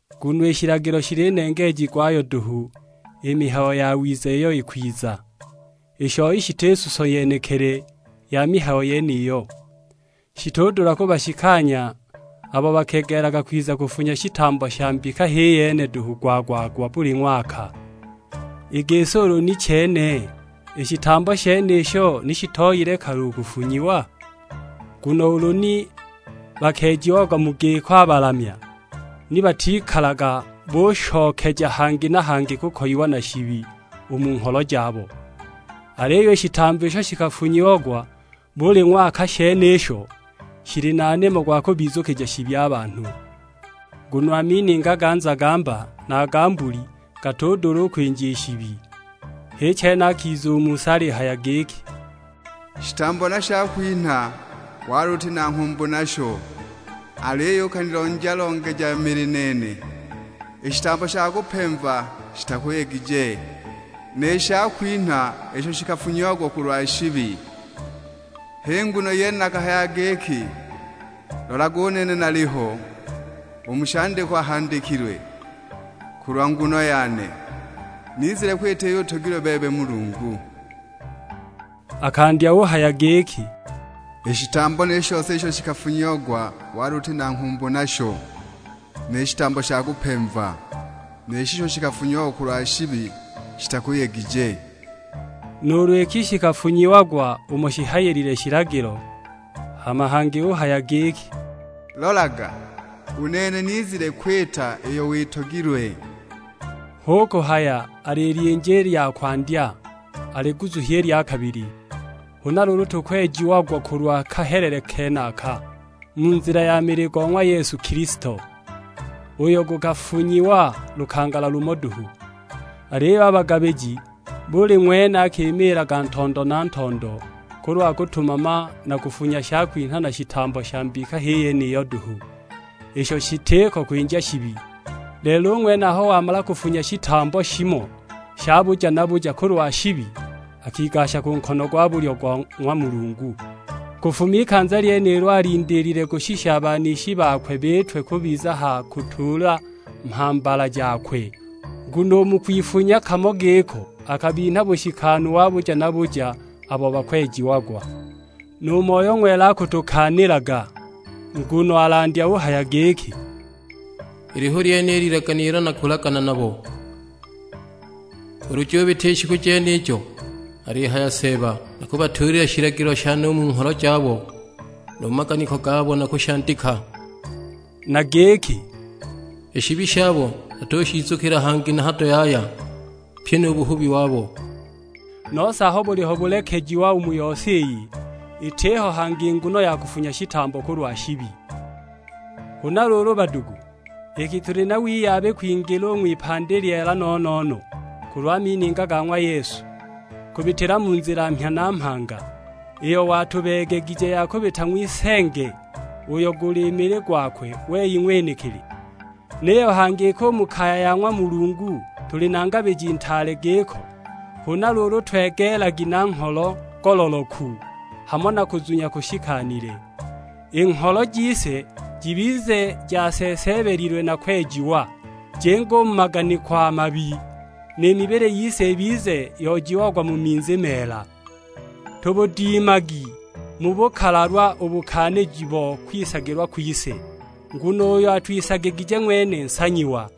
Nguno i shilagilo shili nengeeji gwayo duhu i mihayo yawiza iyo ikwiza; i shoi shiti suso yenekili ya mihayo yeniyo. Shitudula kubashikanya abo bakegeelaga kwiza kufunya shitambo sha mbika h'i yene duhu gwa-gwa-gwa buli ng'waka! I gisi ulu ni chene, i shitambo shenisho ni shitooyile kale u kufunyiwa? Nguno ulu ni bakeejiagwa mu giko a balamya, ni batikalaga bushokeja hangi na hangi kukoyiwa na shibi u mu ngholo jabo. Aliyo i shitambo isho shikafunyiagwa buli ng'waka shenisho, shili na nimo gwa kubizukija shibi a banhu. Nguno a mininga ga nzagamba na a ga mbuli, gatudula u kwinja i shibi. H'i chene akiza u mu si alihaya giki, "Shitambo na shakwinha, wali uti na nghumbu nasho, aliyo ukanilonja-longeja mili nene. I shitambo sha kupemva shitakuyegije, ni shakwinha isho shikafunyiagwa kulwa shibi! H'i nguno yene nakahaya giki, 'Lolaga, u nene naliho, u mu shandikwa handikilwe kulwa nguno yane; nizile kwita iyo utogilwe bebe Mulungu.' " Akandya uhaya giki, "I shitambo ni shose isho shikafunyiagwa wali uti na nghumbu nasho; ni shitambo sha kupemva, ni shisho shikafunyiagwa kulwa shibi shitakuyegije;" nuulu iki shikafunyiagwa umo shihayilile shilagilo. Hama hangi uhaya giki, "Lolaga, u nene nizile kwita iyo witogilwe". Hu kuhaya alilyinja i lya kwandya, aliguzuhye i lya kabili. Huna luulu, tukwejiagwa kulwa kahelele kenaka; mu nzila ya mili go ng'wa Yesu Kilisto, uyo gukafunyiwa lukangala lumo duhu. Aliyo a bagabiji, buli ng'wene akimiilaga ntondo na ntondo kulwa kutumama na kufunya shakwinha na shitambo sha mbika h'i yeniyo duhu; isho shitiko kwinja shibi! Lelo u ng'wene aho wamala kufunya shitambo shimo sha buja na buja kulwa shibi, akigasha ku nkono gwa bulyo go ng'wa Mulungu. Kufuma ikanza lyenilo alindiilile, kushisha a banishi bakwe biitwe kubiza ha kutuula mhambala jakwe. Nguno u mu kwifunya kamo giko, akabinha bushikanu wa buja na buja abo bakwejiagwa. Nu Moyo Ng'wela akutukaanilaga, nguno alandya uhaya giki, "Ili hu lyene i lilagane ilo nakulagana nabo ulu jubita i shiku jenijo; alihaya Seeba. Nakubatuulila shilagilo shane u mu ngholo jabo, nu mu maganiko gabo nakushandika." Na giki, "I shibi shabo natushizukila hangi na hado yaya, pyi nu buhubi wabo." Nose aho buliho bulekejiwa u mu yose iyi, itiho hangi nguno ya kufunya shitambo kulwa shibi. Huna luulu badugu, iki tuli na wiyabi kwingila u ng'wipandi lyeela no-no-no kulwa mininga ga ng'wa Yesu, kubitila mu nzila mhya na mhanga, iyo watubeegegije ya kubita ng'wisenge, uyo guli mili gwakwe wei ng'wenekili, niyo hangi iki u mu kaya ya ng'wa Mulungu tuli na Ngabiji Ntaale giko, huna luulu, twegeelagi na ngholo ngololoku, hamo na kuzunya kushikanile. I ngholo jise jibize jaseeseebelilwe na kwejiwa, jinge u mu maganiko a mabi; ni mibili yise ibize yoojiagwa mu minzi meela. Tubudimagi mu bukalalwa u bukaaniji bo kwisagilwa kwise, nguno uyo atwisagigije ng'wene nsanyiwa.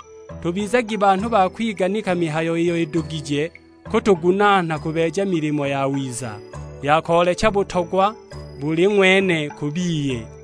Tubizagi banhu ba kwiganika mihayo iyo idugije kutugunaana kubeeja milimo yawiza, ya koolecha butogwa buli ng'wene ku biye.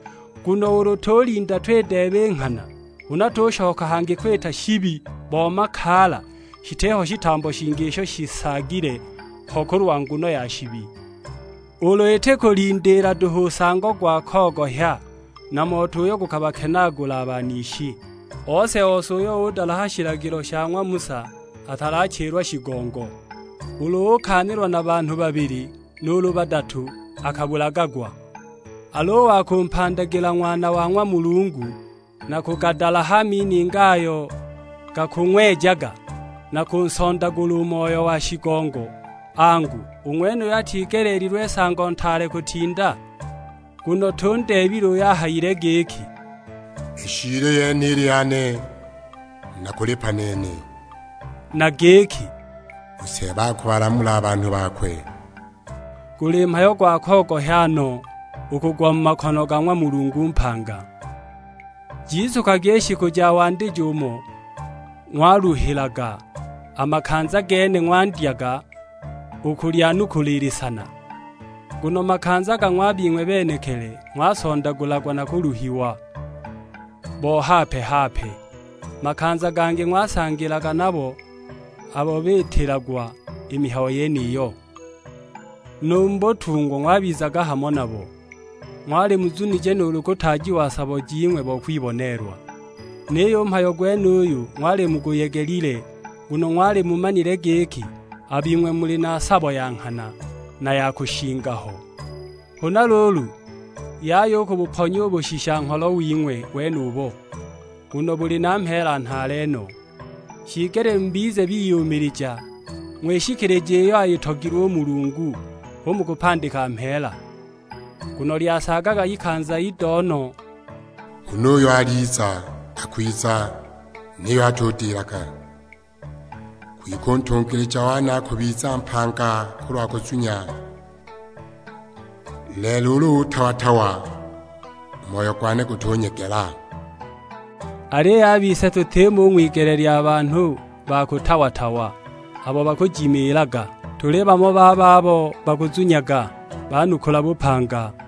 Nguno ulu tulinda twideeba i nghana huna tushoka hangi kwita shibi bo makaala, shitiho shitambo shingi isho shisaagile ho kulwa nguno ya shibi; ulu iti kulindiila duhu nsango gwa kogohya, na moto uyo gukubakenaagula a banishi. Ose-ose uyo udalaha shilagilo sha ng'wa Musa atachilagwa shigongo; ulu ukaanilwa na banhu babili nuulu badatu akabulagagwa. Al'u wa kumpandagila Ng'wana wa ng'wa Mulungu na kugadalaha a mininga ayo gakung'wejaga, na kunsondagula u Moyo wa shigongo, angu, u ng'wenuyo atigeleelilwe nsango ntaale kutinda? Nguno tundeebile uyo ahayile giki, "I shiili yene ili yane, nakulipa nene." Na giki, "U Seeba akubalamula a banhu bakwe." Guli mhayo gwa kogohya no u kugwa mu makono ga ng'wa Mulungu mpanga! Jizukagwi i shiku ja wandijo umo ng'waluhilaga, a makanza gene ng'wandyaga u kulyanukula i lisana. Nguno makanza gamo a bing'we benekili ng'wasondagulagwa na kuluhiwa bo hape-hape; makanza gangi ng'wasangilaga nabo abo biitilagwa i mihayo yeniyo. Nu mu butungwa ng'wabizaga hamo nabo, ng'wali muzunije nuulu kutaajiwa sabo jing'we bo kwiboneelwa. Niyo u mhayo gwenuyo ng'wali muguyegelile, nguno ng'wali mumanile giki a bing'we muli na sabo ya nghana, na ya kushinga ho. Huna luulu, yaya u kubuponya u bushisha-ngholo wing'we wenubo, nguno buli na mheela nhaale no. Shiigelile mubize biyumilija, ng'wishikilije iyo ayitogilwe u Mulungu, hu mukupandika mheela. Nguno lyasaagaga ikanza ido no, huna uyo aliza, akwiza; niyo atudilaga. Kwike u ntungilija wane akubiza mpanga kulwa kuzunya; lelo ulu utawa-tawa, u moyo gwane gutunyegela! Aliyo a bise tutimo u ng'wigele lya banhu ba kutawa-tawa, abo bakujimiilaga; tuli bamo ba babo bakuzunyaga banukula bupanga.